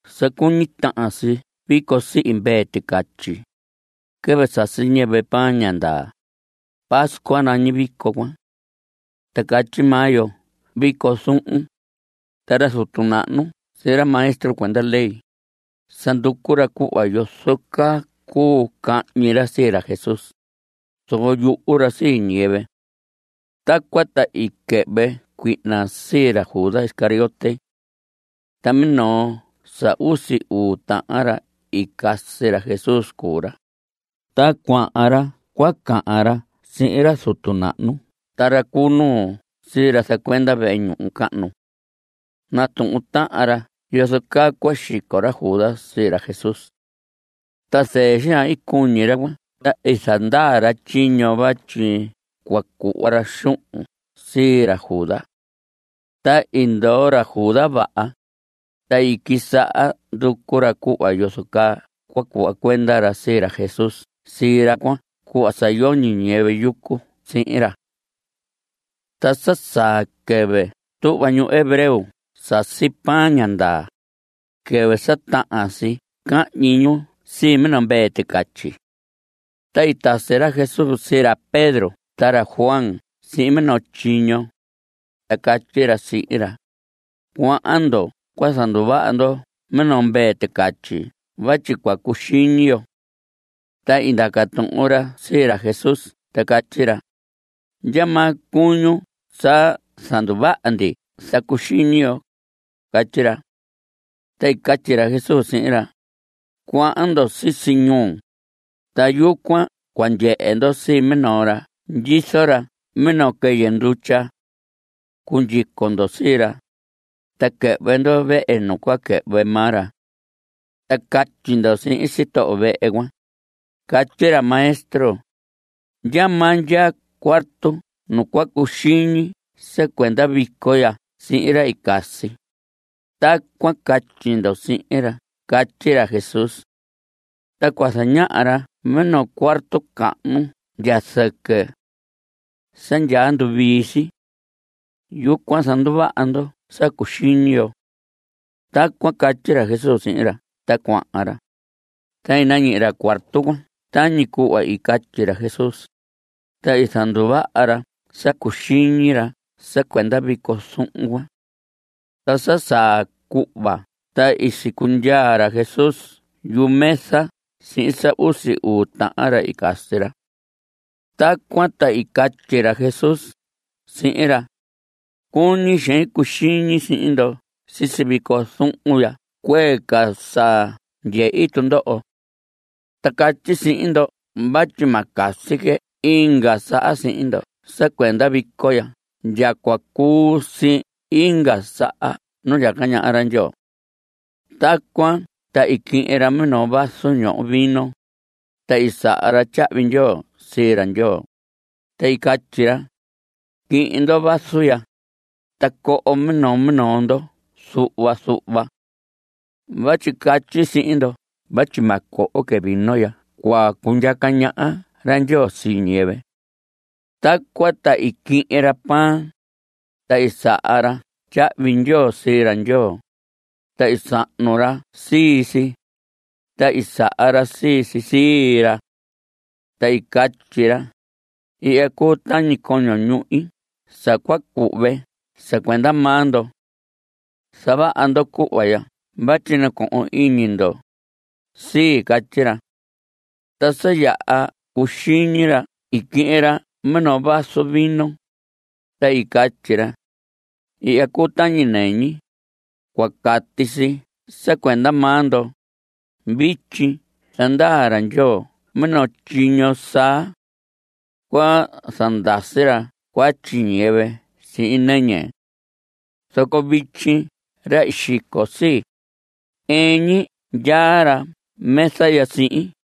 Sa cuñi tahan si vico sihi mvee ticatyi. Quɨvɨ sasi ñiyɨvɨ pan ña ndaa. Pascua nañi vico cuan. Ta catyi maa yo vico zuhun. Ta ra zutu nahnu sihin ra maestro cuenda ley, sa nducu ra cuhva yozo caa cuu cahñi ra sii ra Jesús, zoco yuhu ra sii ñiyɨvɨ. Tacuan ta i quɨhvɨ cuihna sii ra Judas Iscariote. Ta minoo sa usi uu tahan ra i casi ra Jesús cuu ra. Ta cuahan ra cua cahan ra sihin ra zutu nahnu ta ra cu nuu sii ra zacuenda vehe ñuhu cahnu. Natuhun tahan ra yozo caa cua xico ra Judas sii ra Jesús. Ta zɨɨ xaan i cuñi ra cuan ta i zandaa ra tyiño vatyi cua cuhva ra xuhun sii ra Judas. Ta i ndoo ra Judas vaha, ta i quisaha nducu ra cuhva yozo caa cua cuhva cuenda ra sii ra Jesús sii ra cuan cuhva sa yoñi ñiyɨvɨ yucu sihin ra. Ta sa saa quɨvɨ tuhva ñu hebreo sasi pan ña ndaa, quɨvɨ sa tahan si cahñi ñu sii minoo mvee ticatyi. Ta i tasi ra Jesús sii ra Pedro ta ra Juan sihin minoo tyiño, ta catyi ra sihin ra: Cuahan ndo cua zanduvaha ndo minoo mvee ticatyi vatyi cua cuxiñi yo. Ta i ndaca tuhun ra sii ra Jesús ta catyi ra: ¿Ndyamaa cuñun sa zanduvaha ndi sa cuxiñi yo? Catyi ra. Ta i catyi ra Jesús sihin ra: Cuahan ndo sisi ñuu. Ta yucuan cua ndyehe ndo sii minoo ra ndyizo ra minoo quɨyɨ ndutya. Cundyico ndo sii ra, ta quɨhvɨ ndo vehe nu cua quɨhvɨ maa ra. Ta catyi ndo sihin sitoho vehe cuan: “Catyi ra Maestro: ¿ndyamaa ndyaa cuarto nu cua cuxiñi sa cuenda vico ya sihin ra i casi?” Tacuan catyi ndo sihin ra catyi ra Jesús. Ta cua zañaha ra minoo cuarto cahnu ndya zɨquɨ. Sa yaha nduvii si. Yucuan zanduvaha ndo sa cuxiñi yo. Tacuan catyi ra Jesús sihin ra. Ta cuahan ra, ta i nañihi ra cuarto cuan tañi cuhva i catyi ra Jesús. Ta i zanduvaha ra sa cuxiñi ra sa cuenda vico zuhun cuan. Ta sa saa cuhva ta i sicundyaa ra Jesús yumesa sihin sa usi uu tahan ra i casi ra. Tacuan ta i catyi ra Jesús sihin ra: Cuñi xein cuxiñi sihin ndo sisi vico zuhun ya cuee ca sa ndyehi tundoho. Ta catyi sihin ndo vatyi ma casi que inga saha sihin ndo sa cuenda vico ya ndya cua cuu si inga saha nu ndyaca ñaha ra Ndyoo. Tacuan ta i quihin ra minoo vaso ñoho vino, ta i saha ra tyahvi ndyoo sii ra Ndyoo, ta i catyi ra: Quihin ndo vaso ya, ta coho minoo minoo ndo zuhva zuhva. Vatyi catyi sihin ndo vatyi ma coho que vino ndya cua cundyaca ñaha ra Ndyoo sii ñiyɨvɨ. Tacuan ta i quihin ra pan. Ta i saha ra tyahvi ndyoo sii ra Ndyoo, ta i sahnu ra sii si, ta i saha ra sii si sii ra. Ta i catyi ra: Ihya cuu tañi coño ñuhi sa cua cuhve sa cuenda maa ndo. Zavaha ndo cuhva ya vatyi nacohon iñi ndo sii. Catyi ra. Ta sa yaha cuxiñi ra i quihin ra minoo vaso vino, ta i catyi ra: Ihya cuu tañi nɨñi. Cua cati si sa cuenda maa ndo. Vityi zandaa ra Ndyoo minoo tyiño saa. Cua zandasi ra cuatyi ñiyɨvɨ sihin nɨñi. Zoco vityi ra sa xico sii, ɨɨn ñi ndyaa ra mesa ya sihin.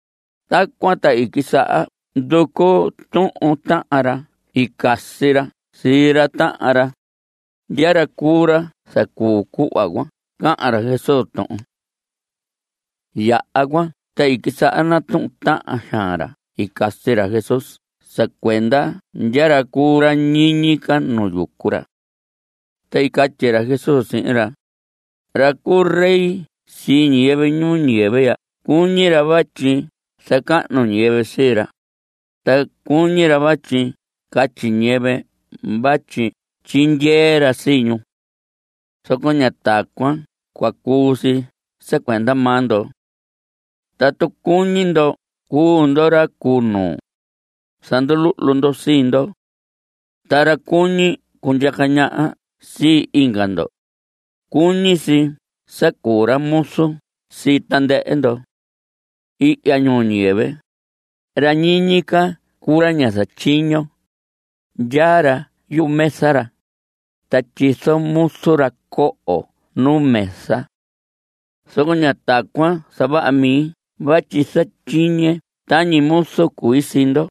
Tacuan ta i quisaha nducu tuhun tahan ra i casi ra sii ra tahan ra, ndya ra cuu ra zacuu cuhva cahan ra Jesús tuhun. Yaha cuan ta i quisaha natuhun tahan xaan ra i casi ra Jesús sa cuenda ndya ra cuu ra ñiñi ca nu yucu ra. Ta i catyi ra Jesús sihin ra: Ra cu rey sii ñiyɨvɨ ñuu ñiyɨvɨ ya cuñi ra vatyi zacahnu ñiyɨvɨ sii ra. Ta cuñi ra vatyi catyi ñiyɨvɨ vatyi tyindyee ra sii ñu. Zoco ña tacuan cua cuu si sa cuenda maa ndo. Tatu cuñi ndo cuu ndo ra cu nuu, zanduluhlu ndo sii ndo. Ta ra cuñi cundyaca ñaha sii inga ndo, cuñi si sa cuu ra muzu sii tandɨhɨ ndo. Ihya ñuu ñiyɨvɨ, ra ñiñi ca cuu ra ña zatyiño. Ndyaa ra yumesa ra, ta tyizo muzu ra coho nu mesa. Zoco ña tacuan zavaha mi vatyi zatyiñe tañi muzu cui sii ndo.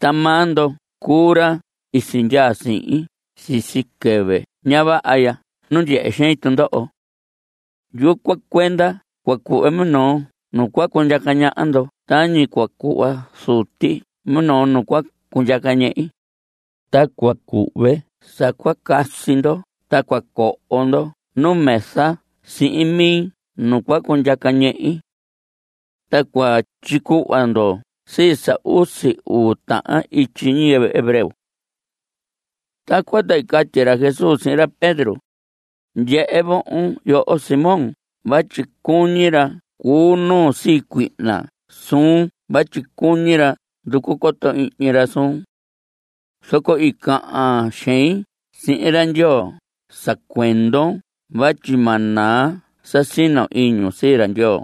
Ta maa ndo cuu ra i sindyaa sihin sisi quɨvɨ ña vaha ya nu ndyehe xein tundoho. Yucuan cuenda cua cuhve minoo nu cua cundyaca ñaha ndo tañi cua cuhva Zuti minoo nu cua cundyaca ñehi. Ta cua cuhve sa cua casi ndo ta cua coho ndo numesa sihin mi nu cua cundyaca ñehi. Ta cua tyicuhva ndo sii sa usi uu tahan ityi ñiyɨvɨ hebreo. Tacuan ta i catyi ra Jesús sihin ra Pedro: Ndyehe vohon yoho Simón vatyi cuñi ra cu nuu sii cuihna suun vatyi cuñi ra nducu coto ihñi ra suun. Zoco i cahan xein sihin ra Ndyoo sa cuendon vatyi ma naa sa sino iñun sii ra Ndyoo.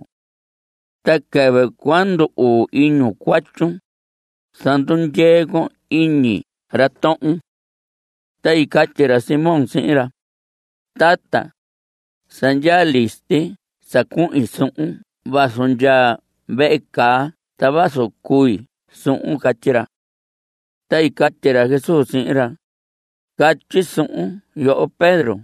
Ta quɨvɨ cua ndu‑uu iñun cuatyun, zandundyee con iñi ra tohon. Ta i catyi ra Simón sihin ra: Tata, sa ndyaa listi sa cuhin suhun vazu ndya vehe caa ta vazu cui suhun. Catyi ra. Ta i catyi ra Jesús sihin ra: Catyi suhun yoho Pedro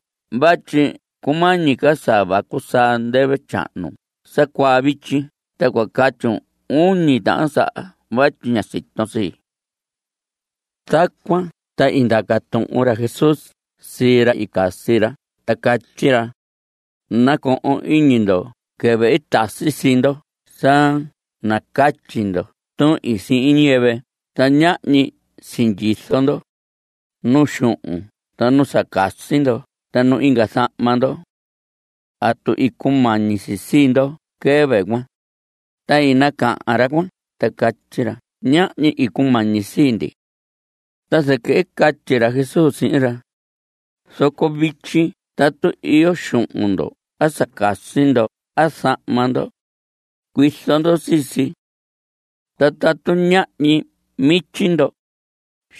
vatyi cumañi ca sa vacu saa ndɨvɨ tyahnu sa cuaa vityi ta cua catyun uñi tahan saha vatyi ña siton sii. Tacuan ta i ndaca tuhun ra Jesús sii ra i casi ra ta catyi ra: Nacohon iñi ndo quɨvɨ i tasi sii ndo sa nacatyi ndo tuhin sihin ñiyɨvɨ ta ñahñi sindyizo ndo, nu xuhun ta nu sa casi ndo ta nu inga zahma ndo. ¿Atu i cumañi si sii ndo quɨvɨ cuan? Ta i nacahan ra cuan ta catyi ra: Ñahñi i cumañi sii ndi. Ta zɨquɨ i catyi ra Jesús sihin ra: Zoco vityi tatu iyo xuhun ndo a sa casi ndo a zahma ndo, cuizo ndo sii si. Ta tatu ñahñi mityi ndo,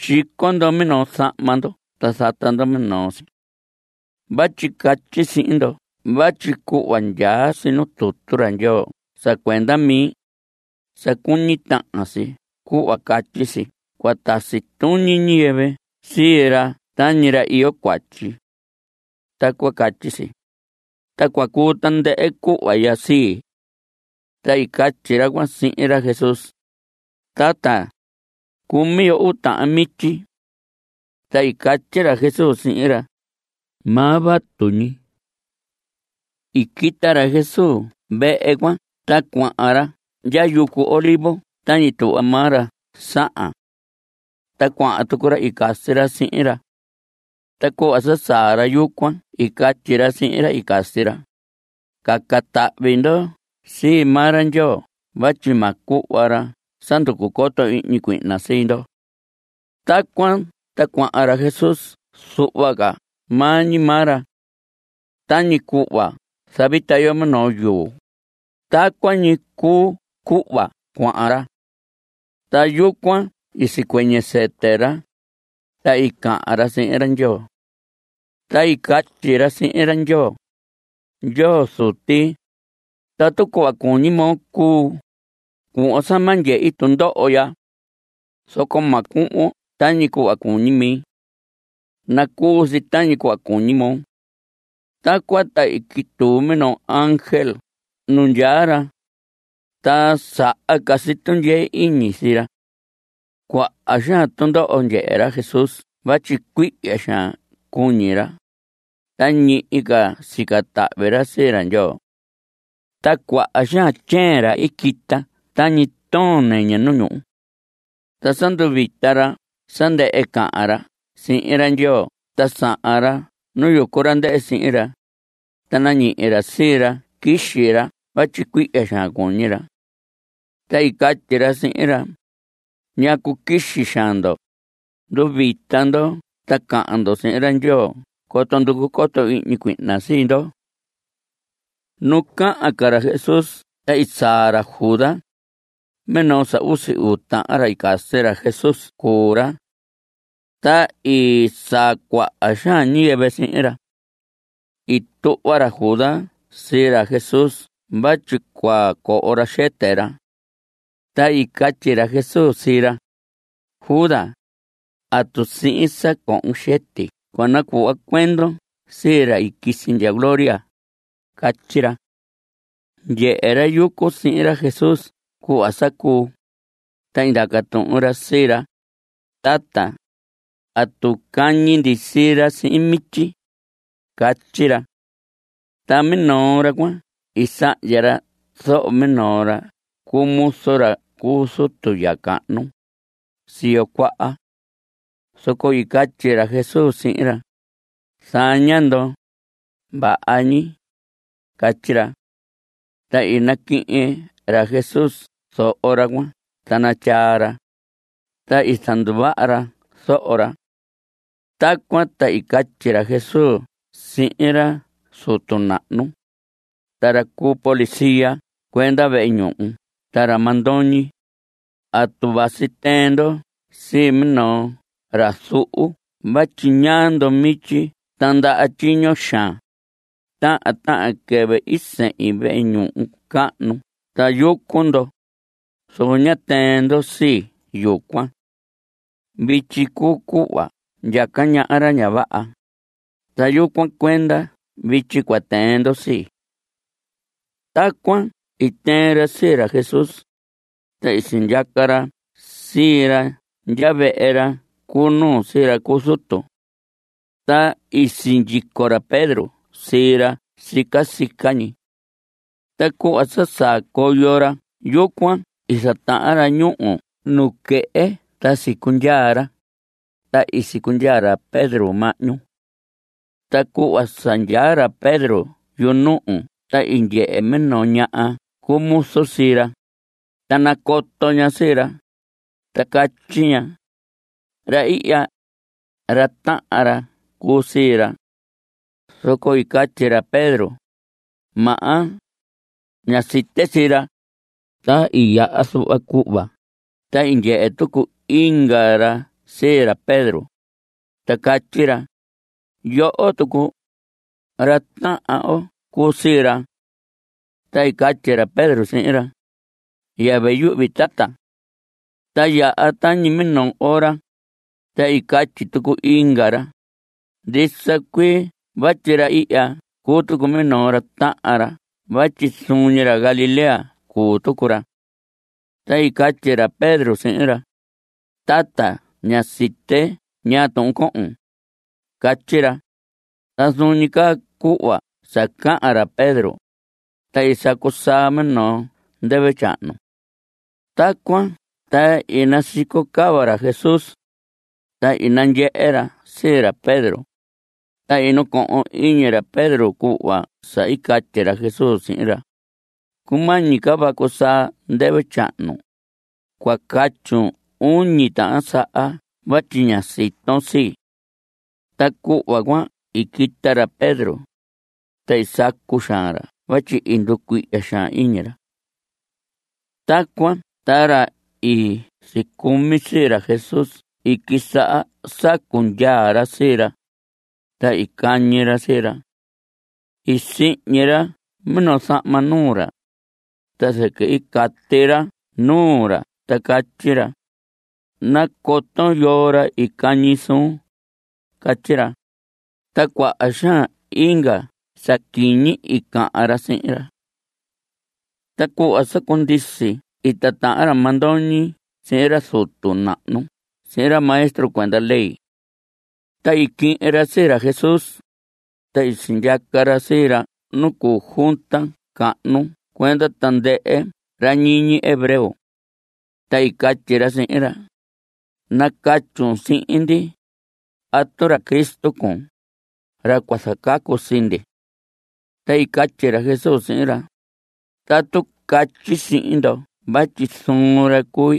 xico ndo minoo zahma ndo ta zata ndo minoo si. Vatyi catyi sihin ndo vatyi cuhva ndyaa si nu tutu ra Ndyoo sa cuenda mi, sa cuñi tahan si cuhva catyi si: “Cua tasi tuñi ñiyɨvɨ sii ra tañi ra iyo cuatyi.” Tacuan catyi si, ta cua cuu tandɨhɨ cuhva ndyaa si. Ta i catyi ra cuan sihin ra Jesús: Tata, cumi yo uu tahan mityi. Ta i catyi ra Jesús sihin ra: Maa vatu ñi. I quita ra Jesús vehe cuan ta cuahan ra ndya yucu Olivos tañi tuhva maa ra sahan. Ta cuahan tucu ra i casi ra sihin ra. Ta cuhva sa saa ra yucuan i catyi ra sihin ra i casi ra: Caca tahvi ndo sii maa ra Ndyoo vatyi ma cuhva ra sa nducu coto ihñi cuihna sii ndo. Tacuan ta cuahan ra Jesús zuhva ca maa ñi maa ra. Tañi cuhva zavita yo minoo yuu, tacuan ñi cuu cuhva cuahan ra. Ta yucuan i sicuɨñɨ sɨtɨ ra, ta i cahan ra sihin ra Ndyoo. Ta i catyi ra sihin ra Ndyoo: Ndyoo Zuti, tatu cuhva cuñi moo cuu, cuhvon sa ma ndyehi tundoho ya. Zoco ma cuhvon tañi cuhva cuñi mi. Nacuu si tañi cuhva cuñi moo. Tacuan ta i quituu minoo ángel nu ndyaa ra, ta saha ca si tundyee iñi sii ra. Cuaha xaan tundoho ndyehe ra Jesús vatyi cuihya xaan cuñi ra, ta ñihi ca sica tahvi ra sii ra Ndyoo. Ta cuaha xaan tyeen ra i quita tañi toon nɨñɨ nu ñuhu. Ta sa nduvita ra sa ndɨhɨ cahan ra sihin ra Ndyoo ta sahan ra nu yucu ra ndɨhɨ sihin ra, ta nañihi ra sii ra quixi ra vatyi cuihya xaan cuñi ra. Ta i catyi ra sihin ra: ¿Ñacu quixi xaan ndo? Nduvita ndo ta cahan ndo sihin ra Ndyoo coto nducu coto ihñi cuihna sii ndo. Nu cahan ca ra Jesús ta i saa ra Judas, minoo sa usi uu tahan ra i casi ra Jesús cuu ra. Ta i saa cuaha xaan ñiyɨvɨ sihin ra. I tuhva ra Judas sii ra Jesús vatyi cua coho ra xɨtɨ ra. Ta i catyi ra Jesús sihin ra: Judas, ¿atu sihin sa cohon xɨti cua nacuhva cuendon sii ra i quisi ndya gloria? Catyi ra. Ndyehe ra yucu sihin ra Jesús cuhva sa cuu, ta ndaca tuhun ra sii ra: Tata, ¿atu cañi ndi sii ra sihin mityi? Catyi ra. Ta minoo ra cuan i sahndya ra zoho minoo ra cu muzu ra cu zutu ya cahnu, siyo cuaha. Zoco i catyi ra Jesús sihin ra: Zaña ndo. Vaha ñi. Catyi ra. Ta i naquihin ra Jesús zoho ra cuan ta natyaa ra. Ta i zanduvaha ra zoho ra. Tacuan ta i catyi ra Jesús sihin ra zutu nahnu, ta ra cu policía cuenda vehe ñuhu ta ra mandoñi: ¿Atu vasi tɨɨn ndo sii minoo ra zuhu vatyi ñaa ndo mityi ta ndaha tyiño xaan? Tahan tahan quɨvɨ i sehin vehe ñuhu cahnu ta yucu ndo, zoco ñá tɨɨn ndo sii yucuan. Vityi cuu cuhva ndyaca ñaha ra ña vaha, ta yucuan cuenda vityi cua tɨɨn ndo sii. Tacuan i tɨɨn ra sii ra Jesús, ta i sindyaca ra sii ra ndya vehe ra cu nuu sii ra cu zutu. Ta i sindyico ra Pedro sii ra sica sica ñi. Ta cuhva sa saa coyo ra yucuan i zatahan ra ñuhu nuquehe ta sicundyaa ra, ta i sicundyaa ra Pedro mahñu. Ta cuhva sa ndyaa ra Pedro yunuhu ta i ndyehe minoo ña cu muzu sii ra, ta nacoto ña sii ra, ta catyi ña: Ra ihya, ra tahan ra cuu sii ra. Zoco i catyi ra Pedro: Maha, ña site sii ra. Ta i yaha zuhva cuhva, ta i ndyehe tucu inga ra sii ra Pedro, ta catyi ra: Yoho tucu, ra tahan oo cuu sii ra. Ta i catyi ra Pedro sihin ra: Yɨvɨ yuhvi, tata. Ta i yaha tañi minoo ora, ta i catyi tucu inga ra: Ndisa cuii vatyi ra ihya cuu tucu minoo ra tahan ra vatyi zuun ñi ra Galilea cuu tucu ra. Ta i catyi ra Pedro sihin ra: Tata, ña site ñaa tuhun cohon. Catyi ra. Ta zuun ñi caa cuhva sa cahan ra Pedro, ta i sacu saa minoo ndɨvɨ tyahnu. Tacuan ta i nasico cava ra Jesús, ta i nandyehe ra sii ra Pedro. Ta i nacohon iñi ra Pedro cuhva sa i catyi ra Jesús sihin ra: “Cumañi ca vacu saa ndɨvɨ tyahnu, cua catyun uñi tahan saha vatyi ña siton sii.” Ta cuhva cuan i quita ra Pedro, ta i sacu xaan ra vatyi i nducuihya xaan iñi ra. Tacuan ta ra i sicumi sii ra Jesús i quisaha sacu ndyaa ra sii ra, ta i cañi ra sii ra. I sihñi ra minoo zahma nuu ra, ta zɨquɨ i cati ra nuu ra ta catyi ra: Nacoton yoo ra i cañi suun. Catyi ra. Ta cuaha xaan inga sa quiñi i cahan ra sihin ra. Ta cuhva sa cundisi i titahan ra mandoñi sihin ra zutu nahnu sihin ra maestro cuenda ley. Ta i quihin ra sii ra Jesús, ta sindyaca ra sii ra nu cuu junta cahnu cuenda tandɨhɨ ra ñiñi hebreo. Ta i catyi ra sihin ra: Nacatyun sihin ndi ¿atu ra Cristo cuun, ra cua zacacu sii ndi? Ta i catyi ra Jesús sihin ra: Tatu catyi sihin ndo vatyi zuun ra cui,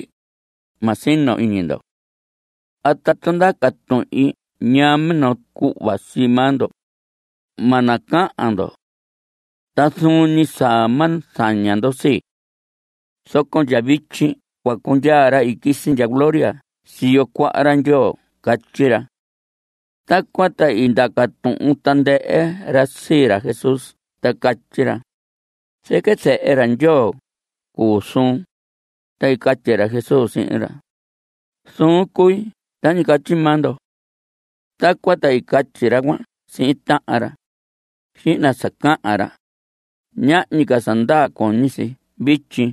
ma sino iñi ndo. A tatu ndaca tuhin ñaa minoo cuhva sii maa ndo, ma nacahan ndo. Ta zuun ñi sa ma zaña ndo sii. Zoco ndya vityi cua cundyaa ra i quisi ndya gloria siyo cuaha ra Ndyoo. Catyi ra. Tacuan ta i ndaca tuhun tandɨhɨ ra sii ra Jesús ta catyi ra: ¿Zɨquɨ zehe ra Ndyoo cuu suun? Ta i catyi ra Jesús sihin ra: Zuun cui tañi catyi maa ndo. Tacuan ta i catyi ra cuan sihin tahan ra: Xihna sa cahan ra. Ñahñi ca sa ndaa cuñi si vityi.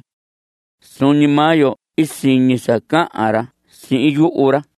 Zuun ñi maa yo i siñi sa cahan ra sihin yuhu ra.